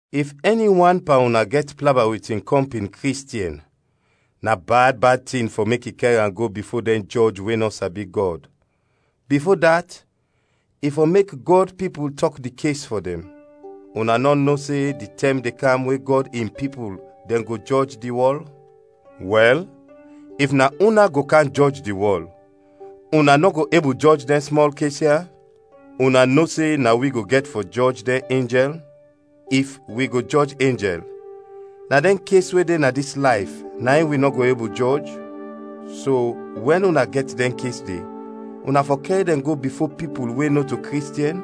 If ɛni wan pan una gɛt plaba wit in kɔmpin Kristiɛn, na bad bad tin fɔ mek i kɛr am go bifo dɛn jɔj we nɔ sabi Gɔd, bifo dat, i fɔ mek Gɔd pipul tɔk di kes fɔ dɛn. Una nɔ no se di tɛm de kam we Gɔd in pipul dɛn go jɔj di wɔl? Wɛl, if na una go kam jɔj di wɔl, una nɔ go ebul jɔj dɛn smɔl kes ya? Una no se na wi go gɛt fɔ jɔj dɛn enjɛl? If wi go jɔj enjɛl, na dɛn kes we de na dis layf na in wi nɔ go ebul jɔj? So, wɛn una gɛt dɛn kes de, una fɔ kɛr dɛn go bifo pipul we nɔto Kristiɛn?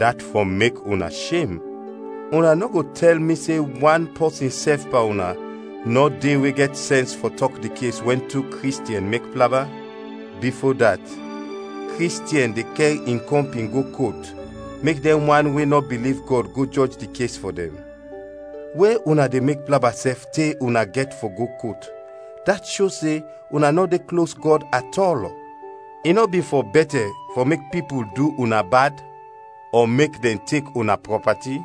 Dat fɔ mek una shem! Una nɔ go tɛl mi se wan pɔsin sɛf pan una nɔ de we gɛt sɛns fɔ tɔk di kes wɛn tu Kristiɛn mek plaba? Bifo dat, Kristiɛn de kɛr in kɔmpin go kot mek dɛn wan we nɔ biliv Gɔd go jɔj di kes fɔ dɛn. We una de mek plaba sɛf te una gɛt fɔ go kot, dat sho se una nɔ de klos Gɔd atɔl. I nɔ bin fɔ bɛtɛ fɔ mek pipul du una bad? Ɔ mek dɛn tek una prɔpati?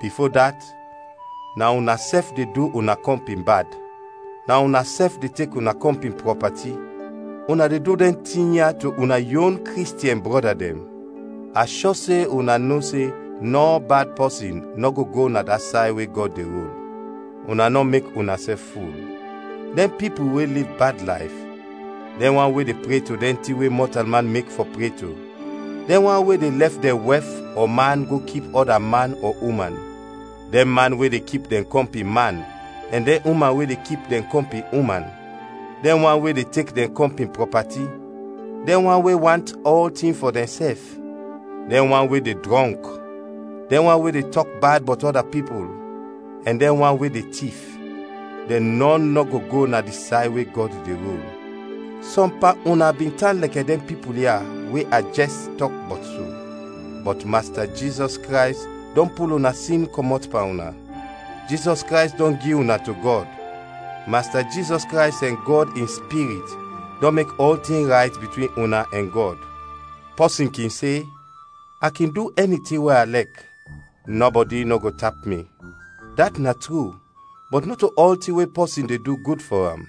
Bifo dat, na unasɛf de du una kɔmpin bad, na unasɛf de tek una kɔmpin prɔpati, una de du dɛn tin ya to una yon Kristiɛn brɔda dɛn. A shɔ se una no se nɔ bad pɔsin nɔ go go na di say we Gɔd de rul. Una nɔ mek unasɛf ful; dɛn pipul we liv bad layf, dɛn wan we de pre to dɛn tin we mɔtalman mek fɔ pre to, dɛn wan we de lɛf dɛn wɛf ɔ man go kip ɔda man ɔ uman, dɛn man we de kip dɛn kɔmpin man ɛn dɛn uman we de kip dɛn kɔmpin uman, dɛn wan we de tek dɛn kɔmpin prɔpati, dɛn wan we want ɔltin fɔ dɛnsɛf, dɛn wan we de drɔnk, dɛn wan we de tɔk bad bɔt ɔda pipul, ɛn dɛn wan we de tif: dɛn nɔn nɔ go go na di say we Gɔd de rul. Sɔm pan una bin tan lɛkɛ dɛn pipul ya we a jɛs tɔk bɔt so. Bɔt Masta Jizɔs Krays dɔn pul una sin kɔmɔt pan una; Jizɔs Krays dɔn gi una to Gɔd; Masta Jizɔs Krays ɛn Gɔd in Spirit dɔn mek ɔltin rayt bitwin una ɛn Gɔd. Pɔsin kin se, “A kin du ɛni tin we a lɛk, nɔbɔdi nɔ go tap mi.” Dat na tru, bɔt nɔto ɔltin we pɔsin de du gud fɔ am.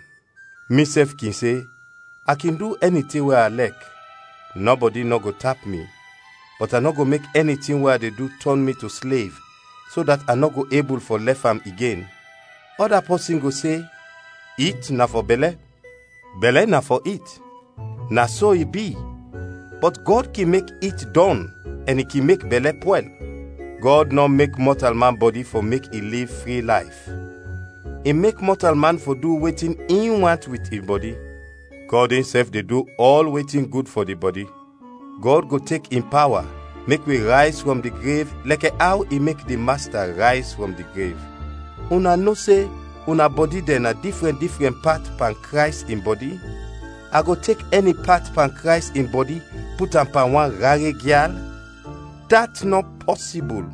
Misɛf kin se, “A kin du ɛni tin we a lɛk, nɔbɔdi nɔ go tap mi,” bɔt a nɔ go mek ɛni tin we a de du tɔn mi to slev so dat a nɔ ebul fɔ lɛf am igen. Ɔda pɔsin go se, “It na fɔ bɛlɛ, bɛlɛ na fɔ it.” Na so i bi, bɔt Gɔd kin mek it dɔn ɛn i kin mek bɛlɛ pwɛl. Gɔd nɔ mek mɔtalman bɔdi fɔ mek i liv fri layf, i mek mɔtalman fɔ du wetin in want wit in bɔdi; Gɔd insɛf de du ɔl wetin gud fɔ di bɔdi. Gɔd go tek in pawa mek wi rayz frɔm di grev lɛkɛ aw i mek di Masta rayz frɔm di grev. Una no se una bɔdi dɛn na difrɛn difrɛn pat pan Krays in bɔdi. A go tek ɛni pat pan Krays in bɔdi put am pan wan rare gyal? Dat nɔ pɔsibul!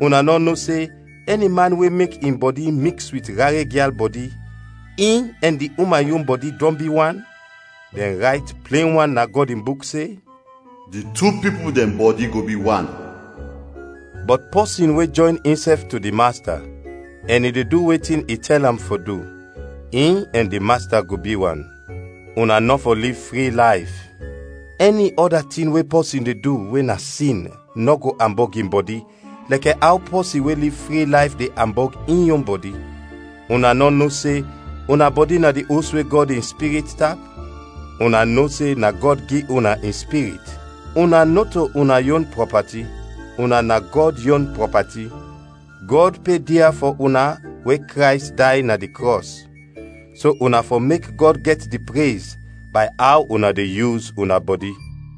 Una nɔ no se ɛni man we mek in bɔdi miks wit rare gyal bɔdi, in ɛn di uman yon bɔdi dɔn bi wan? Dɛn rayt plen wan na Gɔd in Buk se, “Di tu pipul dɛn bɔdi go bi wan.” Bɔt pɔsin we jɔyn insɛf to di Masta, ɛn i de du wetin i tɛl am fɔ du, in ɛn di Masta go bi wan. Una nɔ fɔ liv fri layf. Ɛni ɔda tin we pɔsin de du we na sin nɔ go ambɔg in bɔdi lɛkɛ aw pɔsin we liv fri layf de ambɔg in yon bɔdi. Una nɔ no se una bɔdi na di os we Gɔd in Spirit tap? Una no se na Gɔd gi una in Spirit. Una nɔto una yon prɔpati, una na Gɔd yon prɔpati. Gɔd pe dia fɔ una we Krays day na di krɔs. So una fɔ mek Gɔd gɛt di prez bay aw una de yus una bɔdi.